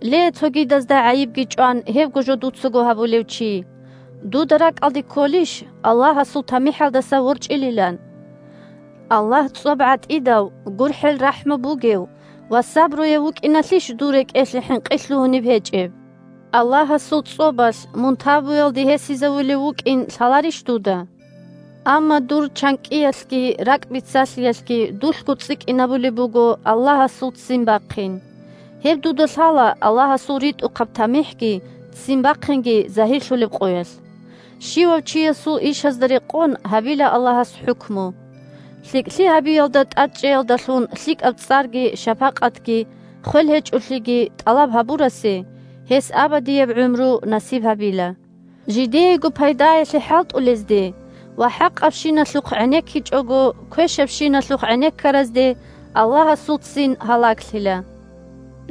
Ле, цогидазда гӀайибги чӀван, гьебго жо дуцаго гьабулев чи, дуда ракӀалде кколищ Аллагьасул тамихӀалдаса ворчӀилилан? Аллагь цӀоб гӀатӀидав, гурхӀел-рахӀму бугев ва сабруяв вукӀиналъищ дур рекӀелъе хӀинкъи лъугьунеб гьечӀеб? Аллагьасул цӀобалъ мун тавбуялде гьесизавулев вукӀин лъаларищ дуда? Амма дур чанкӀкӀиялъги ракӀбицалъиялъги дулъго цӀикӀкӀинабулеб буго Аллагьасул ццин бахъин. Гьеб дуда лъала Аллагьасул ритӀухъаб тамихӀги ццин бахъинги загьирлъулеб къоялъ. Щивав чиясул ишазда рекъон гьабила Аллагьас хӀукму. ЛъикӀлъи гьабиялда тӀадчӀеялдалъун лъикӀаб цӀарги, шапакъатги, хвелгьечӀолъиги тӀалаб гьабурасе гьес абадияб гӀумру насиб гьабила. Жидеего пайдаялъе хӀалтӀулезде ва, хӀакъабщиналъухъ гӀенеккичӀого, квешабщиналъухъ гӀенеккаразде Аллагьасул ццин гьалаглъила.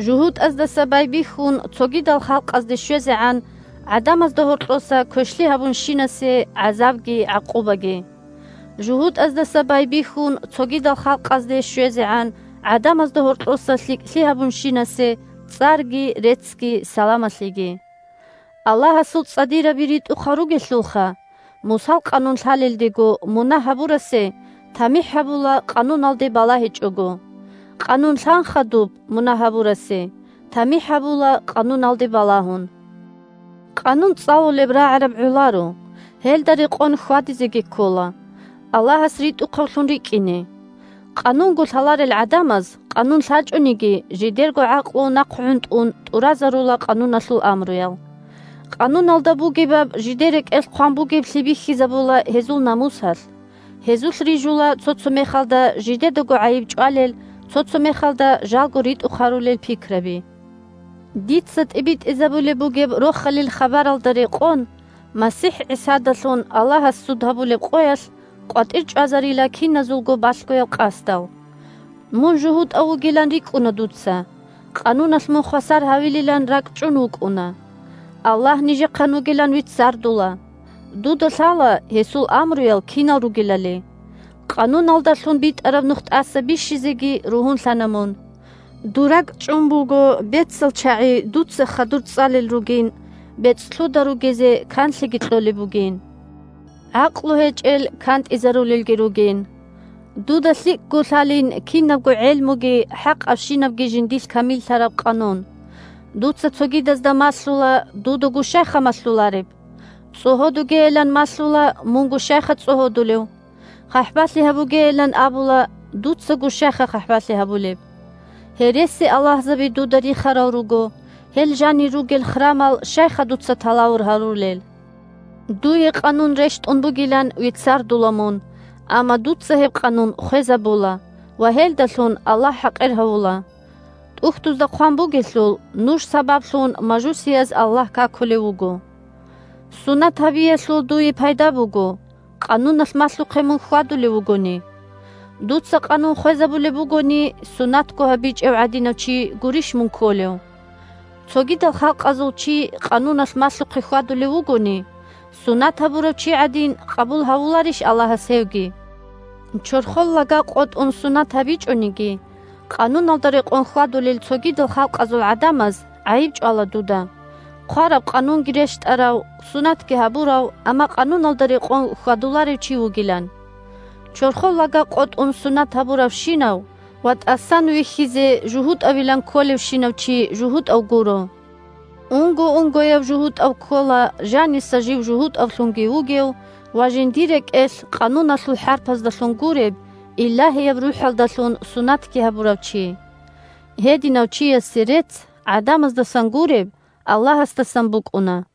ЖугьутӀаздаса байбихьун цогидал халкъазде щвезегӀан гӀадамазда гьоркьоса квешлъи гьабунщинасе – гӀазабги гӀакъубаги! ЖугьутӀаздаса байбихьун цогидал халкъазде щвезегӀан гӀадамазда гьоркьоса лъикӀлъи гьабунщинасе – цӀарги, реццги, саламалъиги! Аллагьасул цӀадираби ритӀухъал ругелъулха! Мусал Къанун лъалелдего мунагь гьабурасе тамихӀ гьабула Къануналде балагьичӀого, Къанун лъан хадуб мунагь гьабурасе тамихӀ гьабула Къануналде балагьун. Къанун цӀалулеб рагӀараб гӀоларо, гьелда рекъон хьвадизеги ккола – Аллагьас ритӀухъавлъун рикӀкӀине. Къанунго лъаларел гӀадамаз, Къанун лъачӀониги, жидерго гӀакълу нахъгӀунтӀун тӀуразарула Къануналъул амруял. Къануналда бугебаб жидер рекӀелъ хъван бугеблъи бихьизабула гьезул намусалъ: гьезулъ рижула цо-цо мехалда жидедаго гӀайиб чӀвалел, цо-цо мехалда жалго ритӀухъ гьарулел пикраби. Дица тӀибитӀизабулеб бугеб Рохалил хабаралда рекъон, МасихӀ ГӀисадалъун Аллагьас суд гьабулеб къоялъ къватӀир чӀвазарила киназулго балъгоял къасдал. Мун жугьутӀав вугилан рикӀкӀуна дуца, Къануналъ мун хвасар гьавилилан ракӀчӀун вукӀуна, Аллагь нижехъан вугилан веццардула, дуда лъала гьесул амруял кинал ругелали, Къануналдалъун битӀараб нух тӀаса бищизеги ругьунлъана мун. Дур ракӀчӀун буго бецал чагӀи дуца хадур цӀалел ругин, бецӀлъуда ругезе канлъиги кьолеб бугин, гӀакълу гьечӀел кантӀизарулелги ругин. Дуда лъикӀго лъалин кинабго гӀелмуги хӀакъабщинабги жиндилъ камиллъараб Къанун. Дуца цогидазда малъула – дудаго щайха малъулареб? ЦӀогьодугейилан малъула – мунго щайха цӀогьодулев? ХъахӀбалъи гьабугейилан абула – дуцаго щайха хъахӀбалъи гьабулеб? Гьересиаллагьзаби дуда рихарал руго – гьел жанир ругел храмал щайха дуца талавур гьарулел? Дуе Къанун рещтӀун бугилан веццарула мун, амма дуца гьеб Къанун хвезабула ва гьелдалъун Аллагь хӀакъир гьавула. ТӀухьдузда хъван бугелъул: «Нуж сабаблъун мажусияз Аллагь какулев вуго». Сунат гьабиялъул дуе пайда буго, Къануналъ малъухъе мун хьвадулев вугони. Дуца Къанун хвезабулеб бугони, сунатго гьабичӀев гӀадинав чи гурищ мун кколев? Цогидал халкъазул чи Къануналъ малъухъе хьвадулев вугони, сунат гьабурав чи гӀадин къабул гьавуларищ Аллагьас гьевги? Чорхол лага къотӀун сунат гьабичӀониги, Къануналда рекъон хьвадулел цогидал халкъазул гӀадамаз гӀайиб чӀвала дуда, хъвараб Къанунги рещтӀарав, сунатги гьабурав, амма Къануналда рекъон хьвадуларев чи вугилан. Чорхол лага къотӀун сунат гьабуравщинав ва тӀасан вихьизе жугьутӀавилан кколевщинав чи жугьутӀав гуро. Унго-унгояв жугьутӀав ккола жаниса жив жугьутӀавлъунги вугев ва жиндир рекӀелъ, Къануналъул хӀарпаздалъун гуреб, Илагьияб РухӀалдалъун сунатги гьабурав чи. Гьединав чиясе рецц, гӀадамаздасан гуреб, Аллагьасдасан букӀуна.